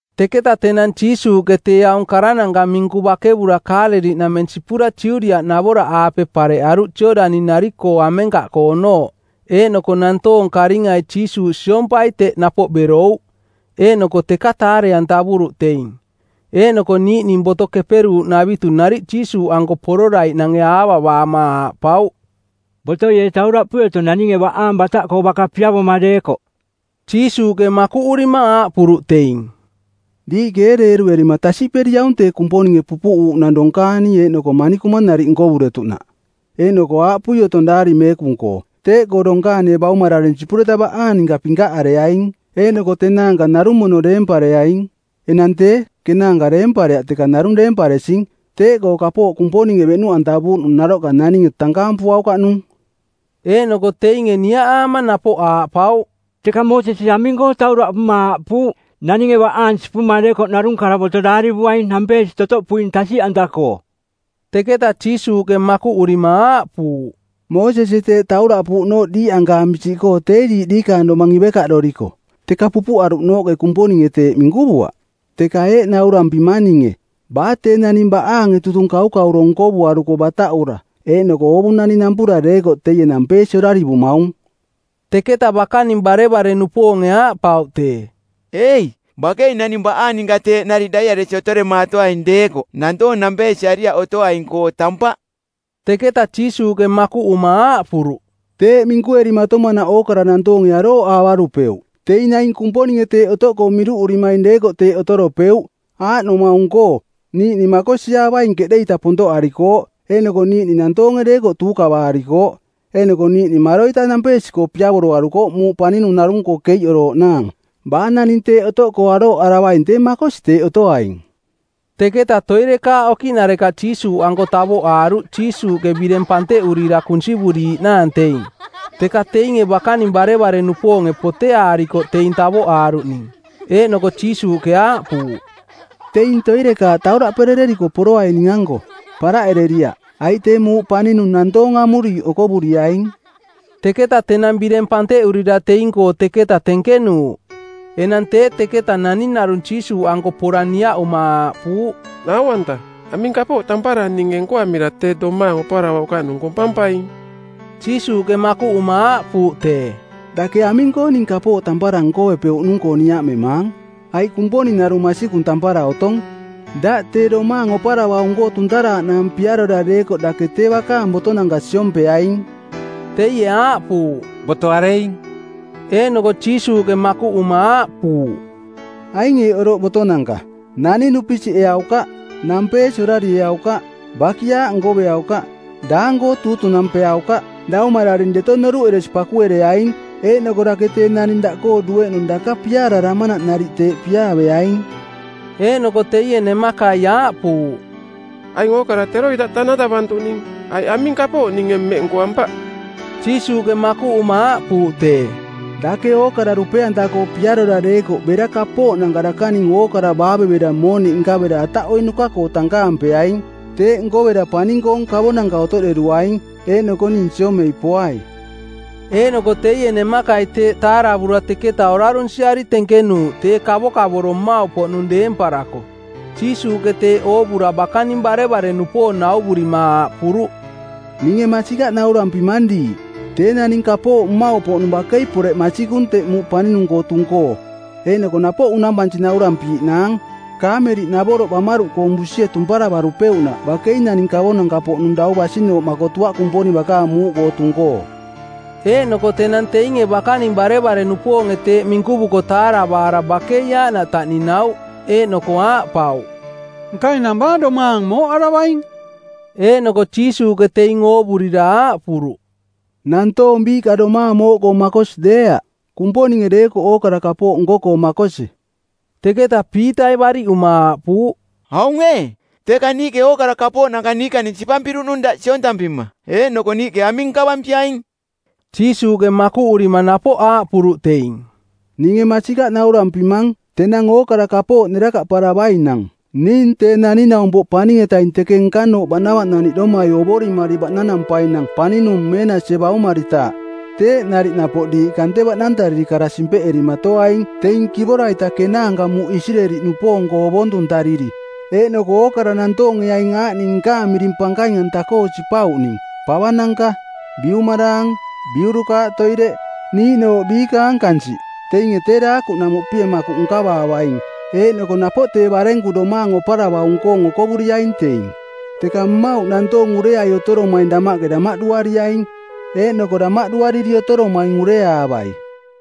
Teketa tenang Jiisuuꞌke tee aung karananka minku bakevura Kaaleliꞌnameng sipura Judiaꞌnavoraꞌaape pareꞌaruꞌ Jooꞌdani-nari-koo amenkaꞌkoonooꞌ. Eeꞌnoko nantoong karingai Jiisuuꞌ siompai teꞌ napoꞌ berouꞌ, eeꞌnoko teka taare-antavuruꞌ teing. Eeꞌnoko niiꞌning boto keperuuꞌnavitu nariꞌ Jiisuuꞌanko pororaiꞌnange aavavaama aaꞌpauꞌ, “Botoi ee tauraꞌpui otong naninge baꞌaang bataꞌkoo baka piavoma deekoꞌ?” Jiisuuꞌke makuꞌurima aaꞌpuruꞌ teing, “Diiꞌke ee deeruerima tasiꞌperiaung tee Kumponinge pupuꞌuuꞌnang donkaani eeꞌnoko manikuma nariꞌ nkovuretuꞌnaꞌ? Eeꞌnoko aaꞌpui otong Daari Meekung-koo, ‘Teeꞌkoo donkaanie baumararing sipureta baꞌaang ninka pinkaꞌareaing, eeꞌnoko tee tenaanka narung mono deempareaing.’ Enang tee, kenaanka deempareaꞌ teka narung deemparesing. Teeꞌkoo kapooꞌ Kumponinge beꞌnuꞌantavuuꞌnung naroꞌka naninge tankaampuaukaꞌnung.” Eeꞌnoko teinge niaꞌaama napoꞌ aaꞌpauꞌ, “Teka Moosesie aming-koo tauraꞌpuma aaꞌpuuꞌ, ‘Naninge baꞌaang sipuma deekoꞌ narung karavoto˜ daarivuaing nampeesi totoꞌpuing tasiꞌanta-koo?’” Teketa Jiisuuꞌke makuꞌurima aaꞌpuuꞌ, “Moosesie teeꞌ tauraꞌpuuꞌnooꞌ diiꞌankaampi siꞌkoo tee diiꞌ diikaang domang ivekaꞌdoriko, teka pupuꞌaruꞌnooꞌke Kumponinge teeꞌ minkuvuaꞌ. Teka eeꞌ naurampimang ninge, baa tee naning baꞌaange tutung kaukauro nkovuaruko bataꞌura eeꞌnoko oovunani nampura deekoꞌ teie nampeesi orarivumaung.” Teketa bakaning barevare-nupoonge aaꞌpauꞌ tee, “Ei, bakei naning baꞌaang ninka teeꞌ nariꞌ daiꞌaresi otoremaatoaing deekoꞌ nantoong nampeesiariaꞌ otoaing-koo tampaꞌ.” Teketa Jiisuuꞌke makuꞌuma aaꞌpuruꞌ, “Teeꞌ minkuerimatomanaꞌ ookara nantoonge arooꞌaavarupeuꞌ, teing naing Kumponinge teeꞌ otoꞌkoo miruꞌurimaing deekoꞌ teeꞌ otoropeuꞌ. Aaꞌnomaung-koo: niiꞌning makosiaavaing keꞌde-ita pontoꞌarikooꞌ, eeꞌnoko niiꞌning nantoonge deekoꞌ tuukavaarikooꞌ, eeꞌnoko niiꞌning maroita nampeesi-koo piavoroarukooꞌ muuꞌ paninung narung-koo keiꞌorooꞌnaang. Baa naning teeꞌ otoꞌkoo arooꞌaravaing tee makosi teeꞌ otoaing.” Teketa toirekaaꞌ okiꞌnarekaꞌ Jiisuuꞌanko tavoꞌaaruꞌ Jiisuuꞌke bireng panteꞌurira kunsivuriiꞌnaang teing. Teka teinge bakaning barevare-nupoonge poteaarikoꞌ teing tavoꞌaaruꞌning. Eeꞌnoko Jiisuuꞌke aaꞌpuuꞌ, “Teing toirekaaꞌ tauraꞌperereriko poroai ning-anko, paraꞌereriaꞌ, aiꞌ tee muuꞌ paninung nantoong amuriiꞌ okovuriaing.” Teketa tenang bireng panteꞌurira teing-koo teketa tenkenuuꞌ. Enang tee teketa naning narung Jiisuuꞌanko pora niaꞌuma aaꞌpuuꞌ, “Nau-anta, aming kapooꞌ tampara ninge nkoamira tee domaang oparavaukaꞌnung kompampaing?” Jiisuuꞌke makuꞌuma aaꞌpuuꞌ tee, “Dake aming-koo ning kapooꞌ tampara nkovepeuꞌnung-koo niaꞌmemaang? Aiꞌ Kumponing narung masikung tampara otong. Daꞌ tee domaang oparavaung-koo tuntaraaꞌnaang piarora deekoꞌ dake tee bakaang botonanka siompeaing.” Teie aaꞌpuuꞌ, “Boto areing?” Eeꞌnoko Jiisuuꞌke makuꞌuma aaꞌpuuꞌ, “Aing eeꞌ oroꞌ botonanka: ‘Naning dupisiꞌeaukaꞌ, Nampeesi orarieaukaꞌ, Bakiaaꞌ nkoveaukaꞌ, Daang-koo tuutunampeaukaꞌ, Daumararing deto noruꞌeresi pakuereaing,’ eeꞌnoko ‘Dake tee naning daꞌkoo dueꞌnung daka piaararamanaꞌ nariꞌ teeꞌ piaaveaing.’” Eeꞌnoko teie nemakai aaꞌpuuꞌ, “Aing ookara teroita tanatavantuꞌning, aiꞌ aming kapooꞌ ninge mmeꞌ nkoampaꞌ?” Jiisuuꞌke makuꞌuma aaꞌpuuꞌ tee, “Dake ookara dupe-anta-koo piarora deekoꞌ bera kapooꞌnanka dakaning ookara baavevera mooniꞌ nkavera ataꞌoiꞌnuka-koo tankaampeaing. Teeꞌ nkovera Paning-koong kavonanka otoꞌderuaing. Eeꞌnoko ning siomei poai.” Eeꞌnoko teie nemakai teeꞌ taaravura teketa orarunsiari tenkenuuꞌ tee kavokavoro mmauꞌpoꞌnung deemparako. Jiisuuꞌke teeꞌ oovura bakaning barevare-nupoong nauvurima aaꞌpuruꞌ, “Ninge masikaꞌ naurampimang diiꞌ, tee naning kapooꞌ mmauꞌpoꞌnung bakei poreꞌ masikung teꞌ muuꞌ paninung-koo tung-koo. Eeꞌnoko napoꞌ unampansi naurampiiꞌnaang, kaameliꞌnavoroꞌ bamaruꞌkoong busie tumparavarupeuꞌnaꞌ bakei naning kavonanka-poꞌnung dau basinooꞌ makotuaꞌ Kumponing bakaang muuꞌkoo tung-koo.” Eeꞌnoko tenang teinge bakaning barevare-nupoonge teeꞌ minkuvuko taaravaara bakei aaꞌnaꞌ taꞌninauꞌ. Eeꞌnoko aaꞌpauꞌ, “Nka enang baa domaang mooꞌaravaing?” Eeꞌnoko Jiisuuꞌke teing oovurira aaꞌpuruꞌ, “Nantoong biiꞌka domaang mooꞌkoo makosi deeaꞌ, Kumponinge deekoꞌ ookara kapooꞌ nko-koo makosi.” Teketa Piitai baariꞌuma aaꞌpuuꞌ, “Aung ee, teka niiꞌke ookara kapooꞌnanka niikaning sipampiruꞌnung daꞌ siontampima, eeꞌnoko niiꞌke aming nkavampiaing?” Jiisuuꞌke makuꞌurima napoꞌ aaꞌpuruꞌ teing, “Ninge masikaꞌ naurampimang, tenang ookara kapooꞌ nerakaꞌparavainang, ning Tee Naning-naumpoꞌ Paning-etaing teke nkanooꞌ baꞌnavaꞌnaniꞌdomai ovorimari baꞌnanampainang paninung meenasie baumaritaaꞌ, teeꞌ nariꞌ napoꞌ diiꞌ kante baꞌnantariri kara simpeꞌerimaatoaing teing kivora-ita kenaanka muuꞌ Isireeli-nupoong-koo ovontuntariri. Eeꞌnoko ookara nantoonge aing aaꞌning nkaang miring pankaing-anta-koo sipauꞌning: pavananka, biumaraang, biurukaaꞌ toireꞌ, niiꞌnooꞌ biikaang kansiꞌ, teinge tee daakuꞌnamuꞌpie makuꞌ nkavaavaing eeꞌnoko napoꞌ tee barenku domaang oparavaung-koong okovuriaing teing. Teka mmauꞌ nantoong ureai otoromaing damaꞌke damaꞌduariaing, eeꞌnoko damaꞌduariri otoromaing ureaavai.”